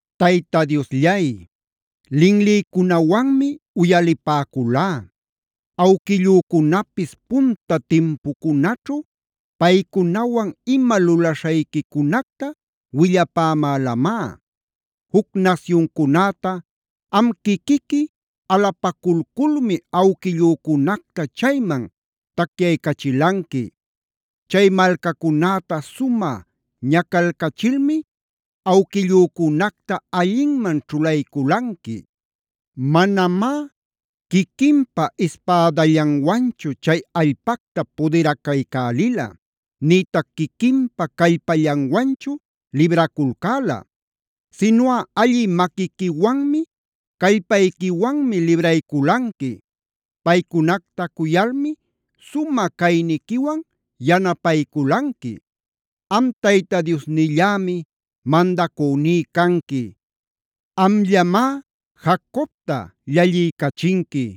Tayta Diosllay, linlïcunawanmi uyalipäculá. Awquillücunapis punta timpucunaćhu paycunawan ima lulaśhayquicunacta willapämälamá. Juc nasyuncunäta am quiquiqui alapaculculmi awquillücunacta chayman tacyaycachilanqui. Chay malcacunäta sumä ñacalcachilmi awquillücunacta allinman ćhulayculanqui. Manamá quiquinpa ispädallanwanchu chay allpacta pudiracaycälila, nïtac quiquinpa callpallanwanchu libraculcäla, sinuꞌa allï maquiquiwanmi, callpayquiwanmi librayculanqui.a Paycunacta cuyalmá sumä cayniquiwan yanapayculanqui. Am Tayta Diosnillämi mandacüní canqui. Amllamá Jacobta llalliycachinqui.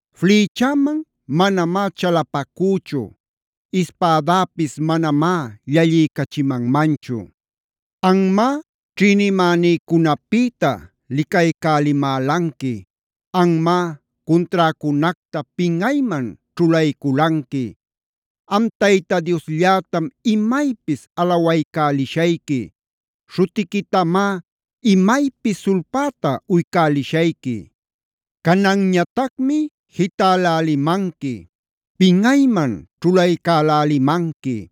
Flïchäman manamá chalapacüchu. Ispädäpis manamá llalliycachimanmanchu. Anmá ćhïnimänïcunapïta licaycälimälanqui. Anmá cunträcunacta pinꞌayman ćhulayculanqui. Am Tayta Diosllätam imaypis alawaycälishayqui. Śhutiquitamá imaypis sulpäta uycälishayqui. Cananñatacmi jitälälimanqui, pinꞌayman ćhulaycälälimanqui.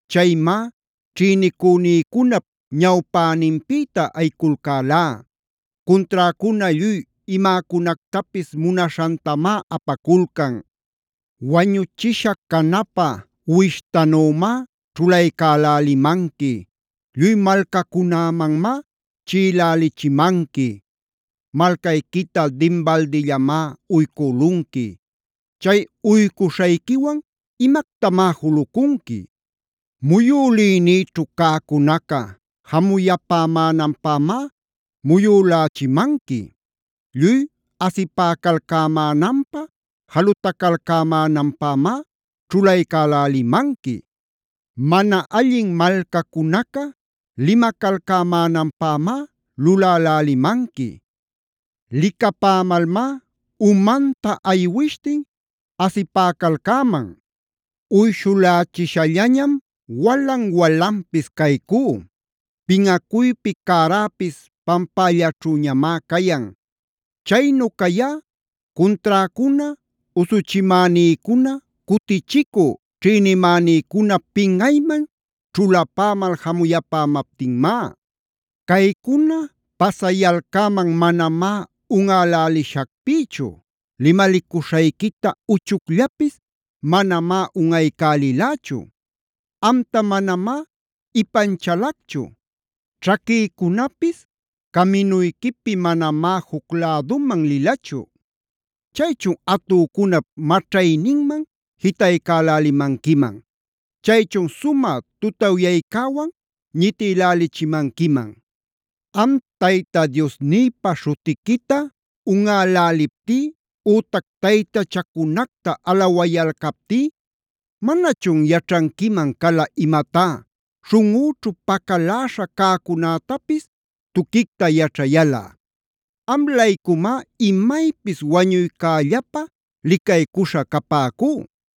Chaymá ćhïnicünïcunap ñawpäninpïta ayiculcälá. Cunträcuna lluy imäcunactapis munaśhantamá apaculcan. Wañuchisha canapä uwishtanümá ćhulaycalälimanqui. Lluy malcacunämanmá chiꞌilälichimanqui. Malcayquita dinbaldillamá uycülunqui. Chay uycuśhayquiwan imactamá julucunqui. Muyülïnïćhu cäcunaca jamuyapämänanpämá muyülächimanqui. Lluy asipäcalcämänanpä, jalutacalcämänanpämá ćhulaycälälimanqui. Mana allin malcacunaca limacalcämänanpämá lulälälimanqui. Licapämalmá umanta aywishtin asipäcalcäman. Uyshulächishallañam walan-walanpis caycú. Pinꞌacuypi cäräpis pampällaćhüñamá cayan. Chaynu cayá cunträcuna, usuchimänïcuna, cutichicü ćhïnimänïcuna pinꞌayman ćhulapämal jamuyapämaptinmá. Caycuna pasayalcäman manamá unꞌälälishacpïchu. Limalicuśhayquita uchucllapis manamá unꞌaycälilächu. Amta manamá ipanchalacchu. Ćhaquïcunapis caminuyquipi manamá juc läduman lilachu. Chaychun atücunap maćhayninman jitaycälälimanquiman. Chaychun sumä tutawyaycäwan ñitïlälichimanquiman. Am Tayta Diosnïpa śhutiquita unꞌäläliptí ütac taytachacunacta alawaycäliptí, ¿manachun yaćhanquiman cala imatá, śhunꞌüćhu pacaläśha cäcunätapis tuquicta yaćhayalꞌa? Am-laycumá, imaypis wañuycällapä licaycuśha capäcú.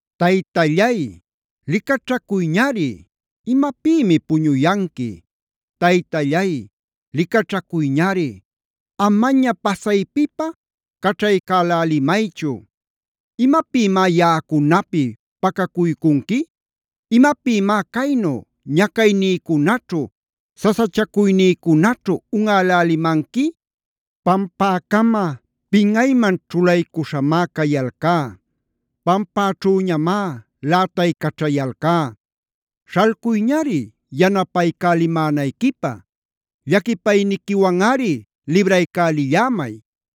Taytallay, ¡licaćhacuyñari! ¿Imapïmi puñuyanqui? Taytallay, ¡licaćhacuyñari! Amaña pasaypipä caćhaycälälimaychu. ¿Imapïmá yaꞌacunapi pacacuycunqui? ¿Imapïmá caynu ñacaynïcunaćhu, sasachacuynïcunaćhu unꞌälälimanqui? Pampäcama pinꞌayman ćhulaycuśhamá cayalcá. Pampäćhüñamá lätaycaćhayalcá. ¡Śhalcuyñari yanapaycälimänayquipä! ¡Llaquipayniquiwanꞌari libraycälillämay!